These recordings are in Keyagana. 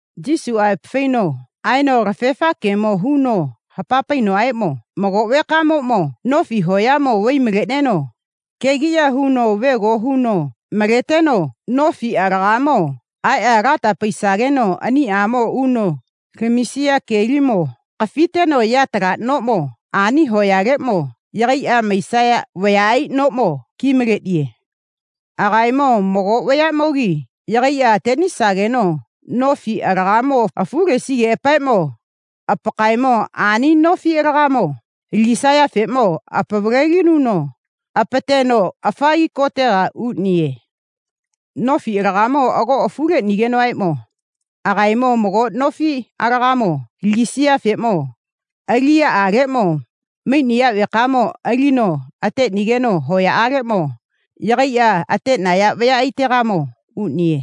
Yesuʼa aepa faino aeno kalafefa gemo huno hapa painoʼaeʼmo, mago vekamoʼmo nofi hoyamo vai maleʼneno kegiʼya huno vego hu maleteno nofi alagamo aeʼa lata paisageno aniʼamo uno lamisiya kelimo kafiteno yatala noʼmo ani hoyaleʼmo yagaiʼa maisaya vayaʼai noʼmo ki maleʼniye. Agaemo mago vayaʼmogi yagaiʼa ateʼnisageno nofi alaga afu lesigeʼapaeʼmo apakaemo ani nofi alagamo lagisayafeʼmo apavaleno apateteno afagi kotega uʼniye. Nofi alagamo ago afu leʼnigenoʼaeʼmo agaemo mago nofi alagamo alisiyafeʼmo aliʼyaʼaleʼmo maiʼniya vekamo alino ateʼnigeno hoyaʼaleʼmo yagaiʼa ateʼnaya vayaʼaitegamo uʼniye.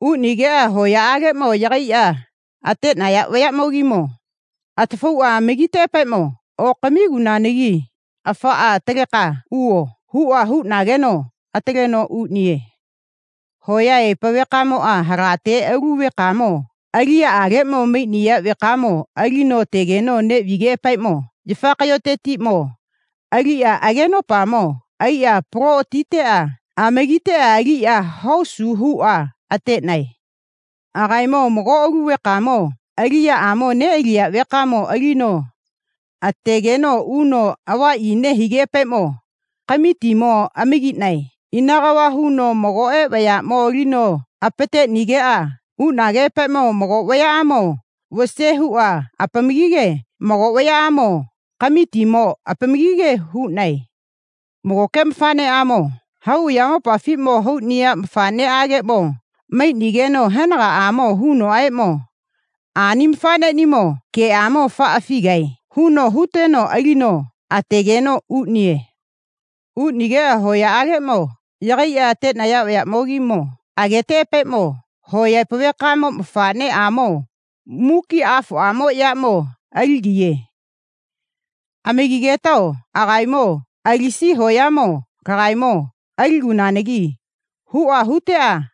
Uʼnigeʼa hoyaʼaleʼmo yagaiʼa ateʼnaya vayaʼmogimo atafauʼa amagiteʼapaeʼmo, okamigunanagi afaʼa ataleka uvo, huʼa huʼnageno ataleno uʼniye. Hoya aepa vekamoʼa halate alu vekamo aliyaʼaleʼmo maiʼniya vekamo alino ategeno neʼvigeʼapaeʼmo yafa kayotetiʼmo aliʼa agenopamo aiʼa apalo atiʼa amagiteʼa aliʼa hosu huʼa ateʼnae. Agaemo mago alu vekamo aliʼyaʼmo neʼaliya vekamo alino ategeno uno avaʼyi nehigeʼapaeʼmo kamitimo amagiʼnae. Ina kava huno magoʼe vayaʼmo alino apateʼnigeʼa uʼnageʼapaeʼmo mago vayaʼamo vase huʼa apamagige mago vayaʼamo kamitimo apamagige huʼae. Magoke mafaʼneʼamo hau ayamopafiʼmo hauʼniya mafaʼneʼageʼmo maiʼnigeno henagaʼamo hunoʼaeʼmo, ani mafaʼneʼnimo geʼamo afaʼa afigae, huno huteno alino ateʼnigeno uʼniye. Uʼnigeʼa hoyaʼaleʼmo yagaiʼa ateʼnaya vayaʼmogimo ageteʼapaeʼmo, hoya aepa vekamo mafaʼneʼamoʼmo muki afoʼamo yaʼmo aligiye. Amagigetao agaemo alisiya hoyamo lagaemo aligunanagi, huʼa huteʼa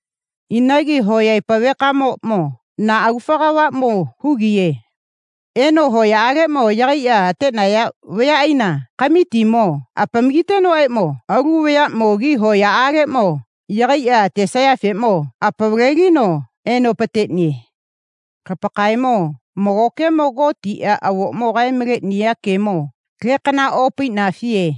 Inagi hoya aepa vekamoʼmo na agufa kavaʼmo hugiye. Eno hoyaʼaleʼmo yagaiʼa ateʼnaya vayaʼaina kamitimo apamagitenoʼaeʼmo alu vayaʼmogi hoyaʼaleʼmo yagaiʼa atesayafeʼmo apavaleno apategaiye. Lapakaemo mago gemo Gotiʼa avoʼmo kae maleʼniya gemo lekana opaiʼnafiye.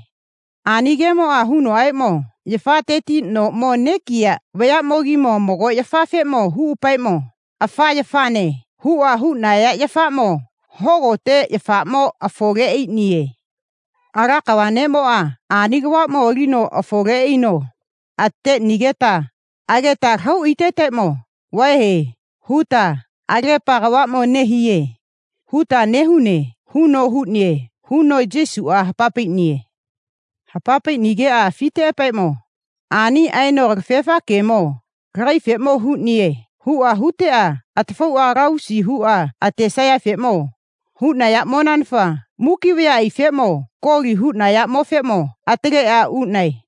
Ani gemoʼa hunoʼaeʼmo, yafatetiʼmo noʼmo nekiya vayaʼmogimo mago yafafeʼmo huʼapaeʼmo, afa yafane, huʼa huʼnaya yafaʼmo hogote yafaʼmo afole aiʼniye. Ala kava neʼmoʼa ani kavaʼmo alino afole aino ateʼnigeta ageta lahau aitetaeʼmo, vae, huta, alagepa kavaʼmo nehiye, huta nehune, huno huʼniye, huno Yesuʼa hapa paiʼniye. Hapa paiʼnigeʼa afiteʼapaeʼmo, ani aeno kalafefa gemo lagaefeʼmo huʼniye, huʼa huteʼa atafauʼa kalavusi huʼa atesayafe huʼnayaʼmonanafa muki vayaʼaifeʼmo koli huʼnayaʼmofeʼmo ataleʼa uʼnae.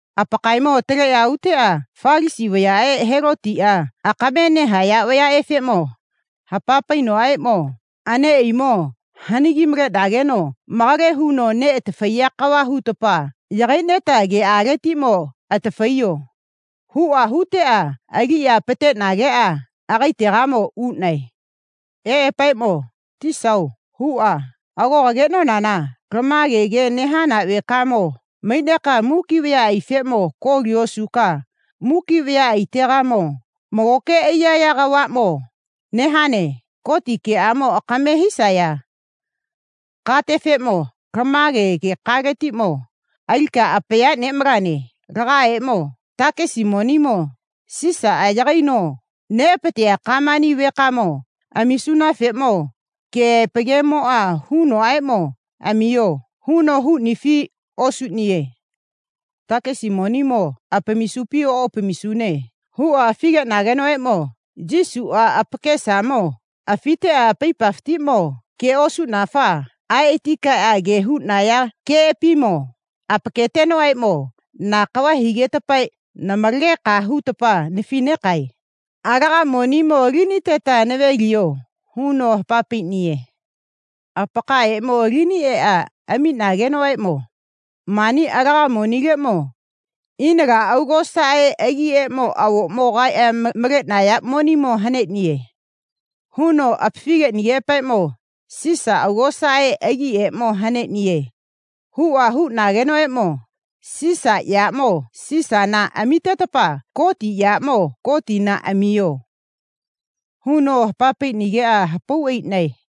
Apakaemo ataleʼa uteʼa Falasi vayaʼe Helotiʼa akame nehaya vayaʼefeʼmo hapa paiʼapaeʼmo, aneʼaimo hanagi maleʼnageno malage huno neʼatafaiya kava hutapa yagaiʼneta geʼaletiʼmo atafaiyo, huʼa huteʼa aliʼa apateʼnageʼa agaetegamo uʼnae. Eʼapaeʼmo, Tisao, huʼa, ago kageʼnonana lama gemo nehana vekamo maiʼneka muki vayaʼaifeʼmo koli osuka muki vayaʼaitegamo magoke aiyaya kavaʼmo nehane. Goti geʼamo akame hisaya katefeʼmo lama gekaletiʼmo alika apaya neʼmalane. Lagaemo takesi monimo Sisaʼa yagaino neʼapateya gamani vekamo amisunafeʼmo keʼaepa gemoʼa hunoʼaeʼmo, amiyo, huno huʼnifi osuʼniye. Takesi monimo apamisupi oʼapamisune huʼa afi geʼnagenoʼaeʼmo Yesuʼa apakesamo afiteʼa apaipafatiʼmo ge osuʼnafa aeʼa ati kaeʼa huʼnaya geʼapimo apaketenoʼaeʼmo, na kava higetapa namalageka huta nafi negae. Laga monimo aliniteta nave liyo, huno hapa paiʼniye. Apakaemo alini eʼa amiʼnagenoʼaeʼmo, mani laga monileʼmo ina la augosaʼe agiʼeʼmo avoʼmo kae maleʼnaya monimo haneʼniye, huno apafi geʼnigeʼapaeʼmo, Sisa augosaʼe agiʼeʼmo haneʼniye, huʼa huʼnagenoʼaeʼmo, Sisa yaʼamo Sisana amitetapa Goti yaʼamo Gotina amiyo, huno hapa paiʼnigeʼa hapau aiʼnae.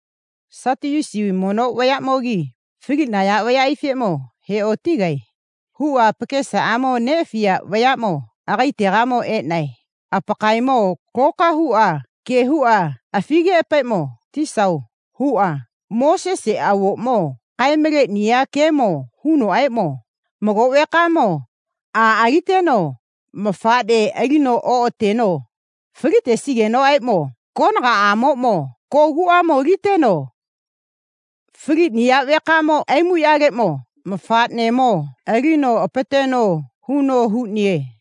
Satiyusi mono vayaʼmogi faliʼnaya vayaʼaifeʼmo he otigae, huʼa apakesamo neʼafiya vayaʼmo agaetegamo eʼnae. Apakaemo loka huʼa ge huʼa afigeʼapaeʼmo, Tisao, huʼa, Moseseʼa avoʼmo kae maleʼniya gemoʼa hunoʼaeʼmo, mago vekamoʼmo a aliteno mafaʼne alino oʼateno falitesigenoʼaeʼmo konagaʼamoʼmo koguʼamo aliteno faliʼniya vekamo aimuʼyaleʼmo mafaʼnemo alino apateno, huno huʼniye.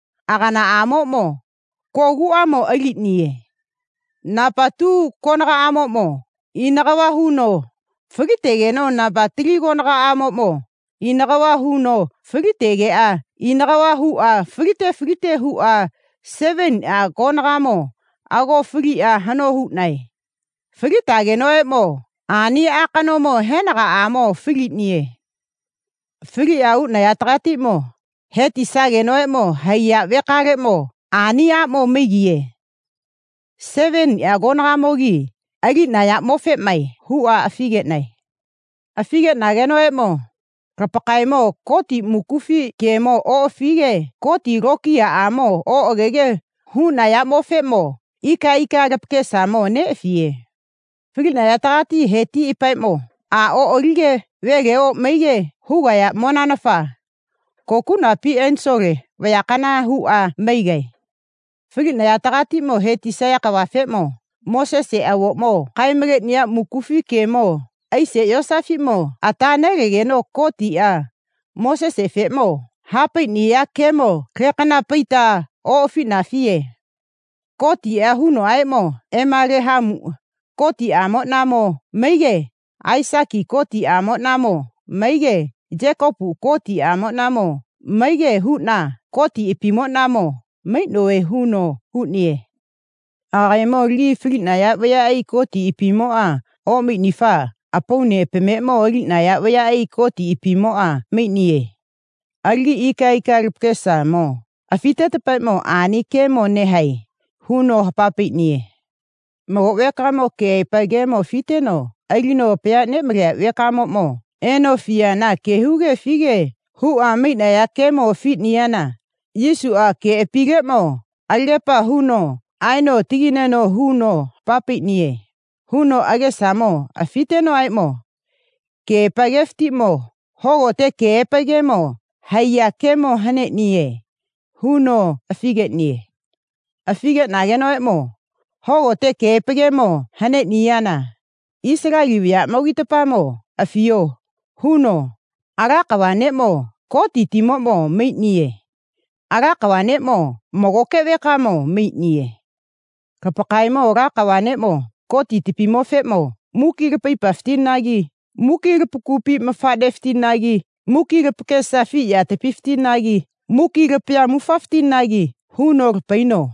aganaʼamoʼmo kogu aʼmo aliʼniye. Napa tu konagaʼamoʼmo ina kava huno falitegeno napa tali konagaʼamoʼmo ina kava huno falitegeʼa ina kava huʼa falite falite huʼa seveniʼa konagamo ago faliʼa hano huʼnae. Falitagenoʼaeʼmo ani a kanomo henagaʼamo faliʼniye. Faliʼa uʼnayategatiʼmo he tisagenoʼaeʼmo haiya vekaleʼmo ani aʼmo maigiye. Seveniʼa konagamogimo aliʼnayaʼmofeʼmae, huʼa afi geʼnae. Afi geʼnagenoʼaeʼmo, lapakaemo Goti mukufi gemo oʼafige Goti lokiyaʼamo oʼagege huʼnayaʼmofeʼmo ika ika lapakesamo neʼafiye. Faliʼnayategatiʼmo he tiʼapaeʼmo a oʼalige vele oʼmaige hugayaʼmonanafa kokuʼnapi enisole vayakana huʼa maigae. Faliʼnayategatiʼmo he tisaya kavafeʼmo Moseseʼa avoʼmo kae maleʼniya mukufi gemo aise yosafatiʼmo ata nelegeno Gotiʼa Mosesefeʼmo ha paiʼniya gemo lekana paita oʼafiʼnafiye. Gotiʼa hunoʼaeʼmo, Emalehamu Gotiʼamoʼnamo maige Aisiki Gotiʼamoʼnamo maige Yekopu Gotiʼamoʼnamo maige huʼna Gotiʼapimoʼnamo maiʼnove, huno huʼniye. Agaemo alagi faliʼnaya vayaʼai Gotiʼapimoʼa oʼmaiʼnifa apauneʼapameʼmo aliʼnaya vayaʼai Gotiʼapimoʼa maiʼniye. Alagi ika ika lapakesamo afiʼnetapaeʼmo ani gemo nehae, huno hapa paiʼniye. Mago vekamo keʼaepa gemo afiteno alino apaya neʼmaleya vekamoʼmo eno afiyana ge huge afige huʼa maiʼnaya gemo afiʼniyana Yesuʼa geʼapileʼmo alagepa huno aeno atagaina huno hapa paiʼniye, huno agesamo afitenoʼaeʼmo, keʼaepa gefatiʼmo hogote keʼaepa gemo haiya gemo haneʼniye, huno afi geʼniye. Afi geʼnigenoʼaeʼmo, hogote keʼaepa gemo haneʼniyana, Isaleli vayaʼmogitapamo afiyo, huno, Ala kava neʼmo Gotitimoʼmo maiʼniye. Ala kava neʼmo magoke vekamo maiʼniye. Lapakaemo Ala kava neʼmo Gotitapimofeʼmo muki lapaipafatinagi muki lapagupi mafaʼnefatinagi muki lapakesa afi yatapifatinagi muki lapaya mufafatinagi huno lapaino.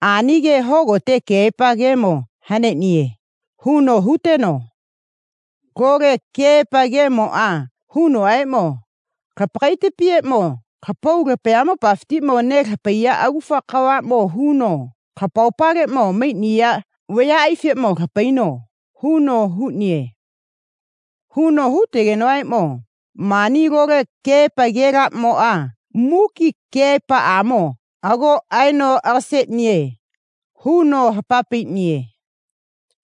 Ani gemo hogote keʼaepa gemo haneʼniye, huno huteno, Lole keʼaepa gemoʼa hunoʼaeʼmo, lapakaitapieʼmo lapau lapayamopafiʼmo nelapaiya agufa kavaʼmo huno lapaopaleʼmo maiʼnaya vayaʼaifeʼmo lapaino, huno huʼniye. Huno hutenoʼaeʼmo, mani lole keʼaepa gelaʼmoʼa muki keʼaepa geʼamo ago aeno aga seʼniye, huno ha paiʼniye.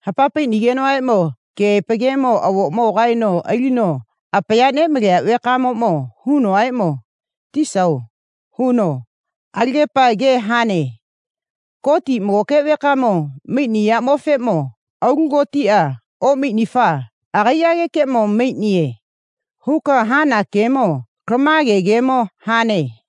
Ha paiʼnigenoʼaeʼmo keʼaepa gemo avoʼmo kaeno alino apaya neʼmaleya vekamoʼmo hunoʼaeʼmo, Tisao, huno, alagepa ge hane. Gotiʼa magoke vekamo maiʼniyaʼmofeʼmo alu gotiʼa oʼmaiʼnifa agaiʼagekeʼmo maiʼniye, huka hana gemo lama gemo hane.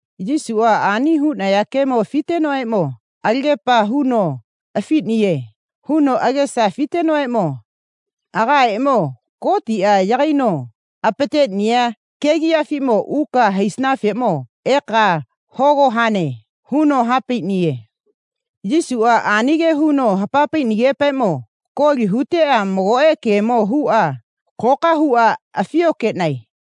Yesuʼa ani huʼniya gemo afitenoʼaeʼmo alagepa huno afiʼniye, huno agesa afitenoʼaeʼmo, kagaemo Gotiʼa yagaino apateʼniya kegiʼyafiʼmo uka haisanafeʼmo eka hogo hane, huno ha paiʼniye. Yesuʼa ani ge huno ha paiʼnigeʼapaeʼmo koli huteʼa magoʼe gemo huʼa loka huʼa afi okeʼnae.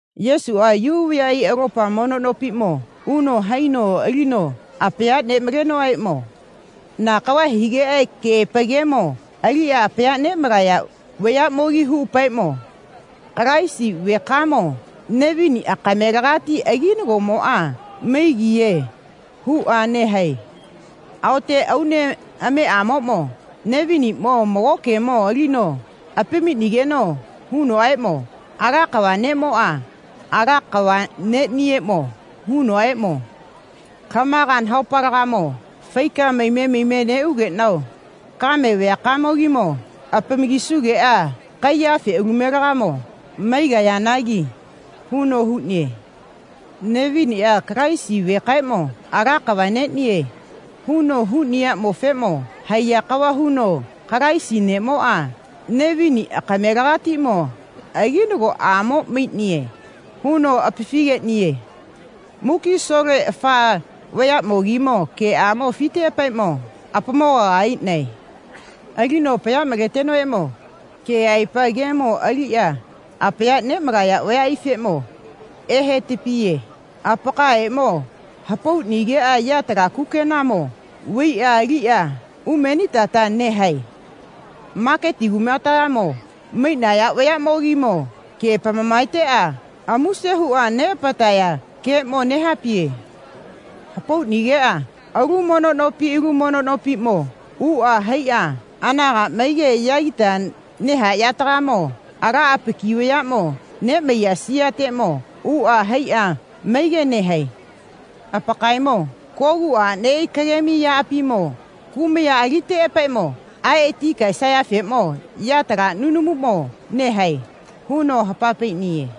Yesuʼa Yu vayaʼai alopa mono nopiʼmo uno haino alino apaya neʼmalenoʼaeʼmo, na kava higeʼa keʼaepa gemo aliʼa apaya neʼmalaya vayaʼmogi huʼapaeʼmo, Kalaisi vekamo Nevini akamelegati aginagoʼamo maigiye, huʼa nehae. Aote Aunemeʼamoʼmo Neviniʼmo mago gemo alino amiʼnigeno hunoʼaeʼmo, Ala kava Neʼmoʼa Ala kava neʼnieʼmo hunoʼaeʼmo, lamaga nahaopaleʼmo faika maime maime neʼugeʼnao kame vayakamo apamagisugeʼa kaiya afeʼalumenaga maigayanagi, huno huʼniye. Neviniʼa Kalaisi vekaeʼmo Ala kava neʼnie, huno huʼniyaʼmofeʼmo haiya kava huno Kalaisi neʼmoʼa Nevini akamelegatiʼmo aginagoʼamo maiʼniye, huno apafi geʼniye. Muki asole afa vayaʼmogimo geʼamo afiteʼapaeʼmo apamogaga aiʼnae. Alino apaya maletenoʼaeʼmo, keʼaepa gemo aliʼa apaya neʼmalaya vayaʼaifeʼmo ehetapiye. Apakaemo hapauʼnigeʼa yatala kukenamo vaiʼa aliteʼa umenitata nehae. Maketi kumateʼmo maiʼnaya vayaʼmogimo ge apamamaeteʼa amuse huʼa neʼapataya geeʼmo nehapaiye. Hapauʼnigeʼa alu mono nopi alu mono nopiʼmo uʼa haiʼa anaga maige yagita nehayategamo ala apaki vayaʼmo neʼmaiya siyateʼmo uʼa haiʼa maige nehae. Apakaemo kogu aʼneʼai kagemi yaʼapimo kumaya aliteʼapaeʼmo aeʼa ati kaesayafeʼmo yatala nunumuʼmo nehae, huno hapa paiʼniye.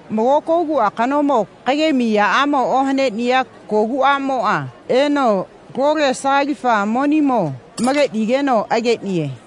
Mago kogu akanomo kagemi yaʼamo ohaneʼniya kogu aʼmoʼa eno lole sagalifa monimo huʼnigeno ageʼniye.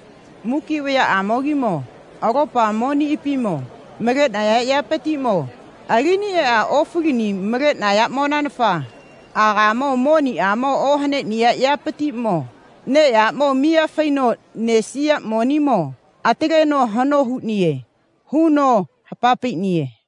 Muki vayaʼamogimo alopa moniʼapimo maleʼnaya yapatiʼmo alini eʼa ofalini huʼnayaʼmonanafa agaemo moniʼamo ohaneʼniya yapatiʼmo neʼyaʼamo miya faino nesiya monimo ataleno hano huʼniye, huno hapa paiʼniye.